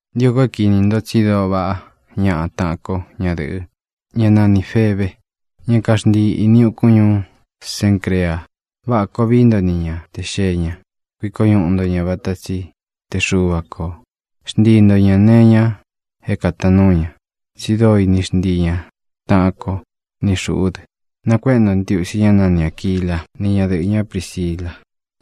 Ntio ko é kīni nto tsi dóo vaꞌá ñaꞌa taꞌan ko ñadɨ̄ꞌɨ, ñá nanī Febe, ñá kaxntii īni ukun ñuú Cencrea. Váꞌa koo vií nto ni ña te xēe ña. Kuiko ñuꞌu nto ña vata tsi te Xuva kō. Xntii nto ñā nee iña é kātaan núu ña, tsi dóo ini xntii ña taꞌan ko, ni xūꞌú dɨ. Nakuéꞌe nto ntiusi ñá nani Āquila ni ñádɨꞌɨ̄ ñá Prisila,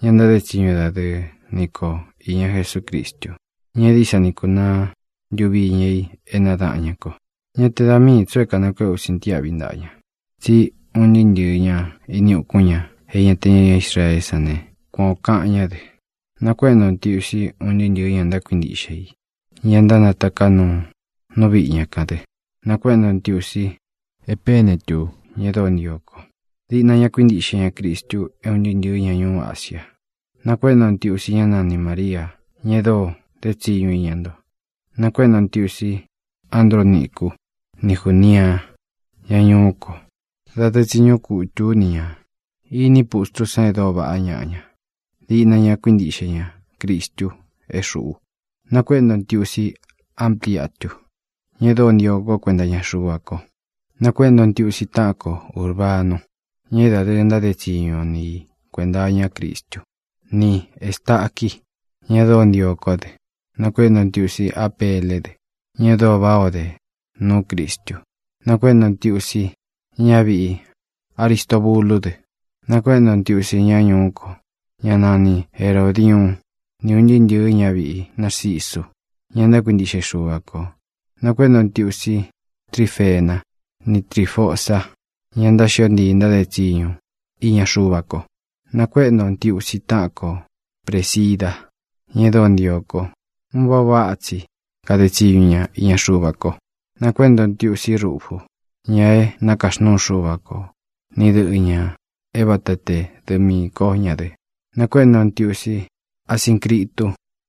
ña ntáde tsiñu dadɨɨ nī ko iña Jesúcristu, ña é dií sa ni kunaá ntuvi iña i é nadaꞌan ñá ko. Ñá te da miī tsu é kānakuéꞌe ú sintiáꞌvi ntaꞌa ña, tsí un ntɨɨ́ ntɨ̄ɨ́ ña ini ukún ña é ña te ña Israeé san ne, kuan ō kaꞌan ñá dɨ. Nakuéꞌe nto ntiusi un ntɨɨ́ ntɨ̄ɨ́ ña ntákuintiꞌxe i, ña ntánataká nuu nú viꞌi ña kān dɨ. Nākuéꞌe nto ntiusi Epenetu, ña e dóo ntio ko. Diꞌna ña kuíntiꞌxe ña Cristu é un ntɨɨ́ ntɨ̄ɨ́ ña ñuú Asia. Nakuéꞌe nto ntiusi ñá nani Māria, ña e dóo dé tsiñu ina nto. Nakuéꞌe nto ntiusi Andrónicu ni Júnia, ña ñuú ko. Dadɨɨ tsi ñúꞌu kutū ú ni ñā. Iní pustrú san e dóo vaꞌá ñaꞌa ña. Diꞌna ña kuíntiꞌxe ña Cristu é xūꞌu. Nakuéꞌe nto ntiusi Amplíatu, ña e dóo ntio kó kuenta iña Xuva ko. Nakuéꞌe nto ntiusi táꞌan ko Ūrbanu, ña é dadɨɨ ntáde tsiñu o ni i kuēnta iñá Cristú, ni Ēstaqui, ña e dóo ntio kó dɨ. Nakuéꞌe nto ntiusi Apéle dɨ, ña e dóo váꞌā o dé nuú Cristu. Nakuéꞌe nto ntiusi ñáviꞌi Aristobulú dɨ. Nakuéꞌe nto ntiusi ñá ñuú ko, ñá nani Herōdiuun, ni un ntɨɨ́ ntɨ̄ɨ́ ñaviꞌí Narcisu, ña ntákuintiꞌxe i Xuva kō. Nakuéꞌe nto ntiusi Trífena ni Trífosa, ña ntáxio ntii ntáde tsiñu iña Xuva ko. Nakuéꞌe nto ntiusi táꞌan ko Prēsida, ña e dóo ntio ko. Un váꞌa ō váꞌa tsi kade tsiñu ña iña Xuva ko. Nakuéꞌe nto ntiusí Rufu, ña é nakaxnúu Xuva kō, ni dɨꞌɨ̄ ña é vata te dɨꞌɨ miī kó ña dɨ. Nakuéꞌe nto ntiusi Asíncritu,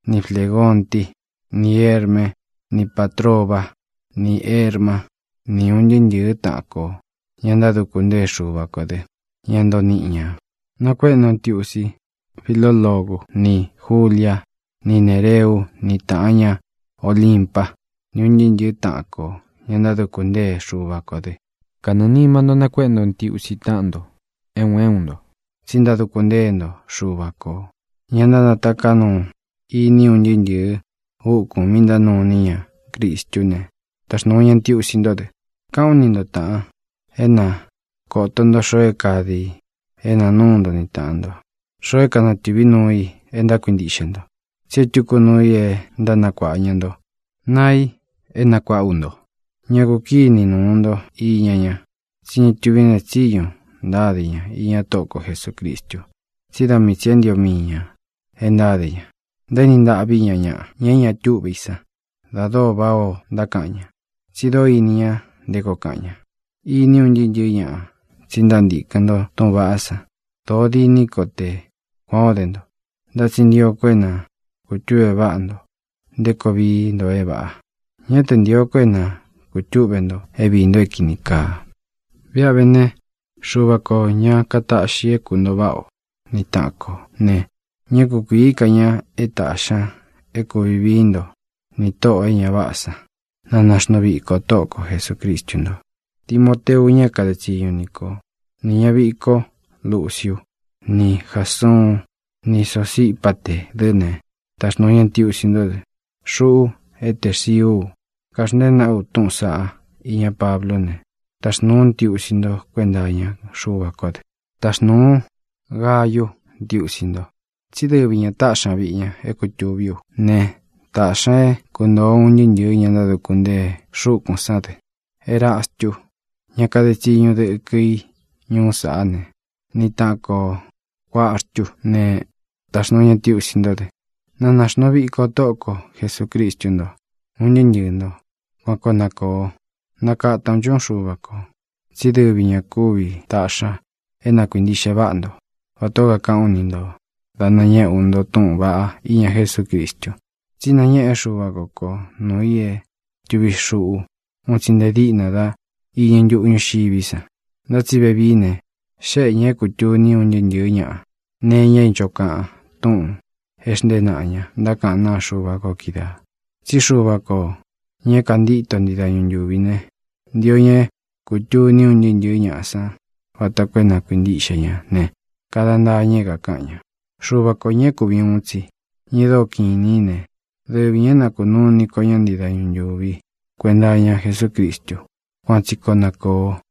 ni Flégonti, ni Hérme ni Pátroba, ni Hérma, ni un ntɨɨ́ ntɨ̄ɨ́ taꞌan kō, ña ntáduku ntée Xuva kō dɨ́, ña ntoo niꞌi ñā. Nakuéꞌe nto ntiusi Filólogu, ní Julia, ni Néreú, ni tāꞌan ña Olimpa, ni un ntɨɨ́ ntɨ̄ɨ́ taꞌan kō, ña ntáduku ntée Xuva kō dɨ. Kanɨɨ̄ nima ntó nakuéꞌe nto ntiusi táꞌan ntō é un é un ntō, tsi ntáduku ntée nto Xuva kō. Ña ntánataká nuu ini un ntɨɨ́ ntɨ̄ɨ́ úkūn mi ntánuu iní ña Cristú ne, taxnūu ña ntiusi ntó dɨ. Káꞌān ú ni nto, tāꞌan, é na kōto nto xoo é kāde i é nāa núu nto ni tāꞌan nto, xoo é kanatɨ̄ví nuu i e ntákuintiꞌxe nto, tsí e túku nuu i e ntánakuāꞌa ña nto naa i é nakuāꞌa ú nto. Ñá ku kīni nuu nto iña ña, tsí ña túvi neé tsiñu ntáde ña iña Tóꞌo ko Jesūcristu, tsí da mii tsī é ntio mii ñā e ntáde ña. Ntaéni ntaꞌví ña ñaꞌa, ña é ña túꞌve i san, da dóo váꞌā ó ntákaꞌan ña, tsi dóo ini ña nté koo kaꞌan ña. Iní un ntɨɨ́ ntɨ̄ɨ́ ñaꞌa tsi ntántīkɨn nto túꞌūn vaꞌá san. Dōó diní ko te kuān ó de nto. Ntá tsi ntio ko é na kūtúꞌve váꞌa nto nté koo vií nto é vāꞌa. Ñá te ntīo ko é na kūtúꞌve nto é viī nto é kīni kaa. Viꞌa vé ne, Xuva kō, ña kataꞌxi é kuntōo váꞌa o ni taꞌan kō ne, ñá kukuīí ka ña é tāꞌxi ña é kūvi vií nto nī Tóꞌō e ña váꞌā san. Na nāxnuu viko Tóꞌo ko Jesūcristu nto. Timoteu, ña é kade tsiñu nī kó, nī ñaviꞌi kó Luciu ni Jásuun ni Sosípaté dɨ ne, taxnūu ña ntiusi ntó dɨ. Xuꞌu é Terciú u, kaxntée nāꞌá u túꞌūn saꞌá iñá Pablú ne, taxnūu ú ntiusi ntó kuenta iña Xuva kó dɨ. Taxnūu Gayú ntiusi nto, tsí dɨvi ñā táꞌxi ña viꞌi ña é kutūví u ne, tāꞌxi ña é kuntōo un ntɨɨ́ ntɨ̄ɨ́ ña ntáduku ntée xúkūn sán dɨ. Erastu, ñá kade tsiñu dɨkɨ i ñuú saꞌá ne, ni taꞌan kō Cuartú ne, taxnūu ña ntiusi ntó dɨ. Na nāxnuu viko Tóꞌo ko Jesūcristu ntó, un ntɨɨ́ ntɨɨ̄ nto. Kuan koo na kōo. ¡Na kata ō nchuꞌún Xuva kō! tsí dɨvi ña kūvi taꞌxi ña é na kuīntiꞌxe váꞌa nto vatā ó kakaꞌán u ni nto dá nañéꞌe ú nto túꞌūn vaꞌá iña Jesúcristu. Tsí nañéꞌe Xúva ko ko nuū i é tūvi xuꞌu un tsi nte díꞌna dá iñɨ ntuꞌu ñúxiví san. Ntá tsi vevií ne, xéꞌe ñā é kūtuni un ntɨɨ́ ntɨ̄ɨ́ ñaꞌa nee iña é ncho kaꞌan túꞌūn e xntée naꞌa ña ntákaꞌán naa Xuva ko kídaā. Tsí Xuva kō, ña é kāntíto ntii dañu ntūvi ne, ntio ña é kūtuni un ntɨɨ́ ntɨ̄ɨ́ ñaꞌa san vata koo é na kuīntiꞌxe ña ne, kada ntaa ña é kākaꞌan ña. Xuva kō, ña é kuvi ūun tsi, ña e dóo kiꞌin inī í ne, dɨvi ñā é na kūnuu iní ko ña ntii dañu ntūvi kuenta iña Jesúcristu. Kuan tsi koo na kōo.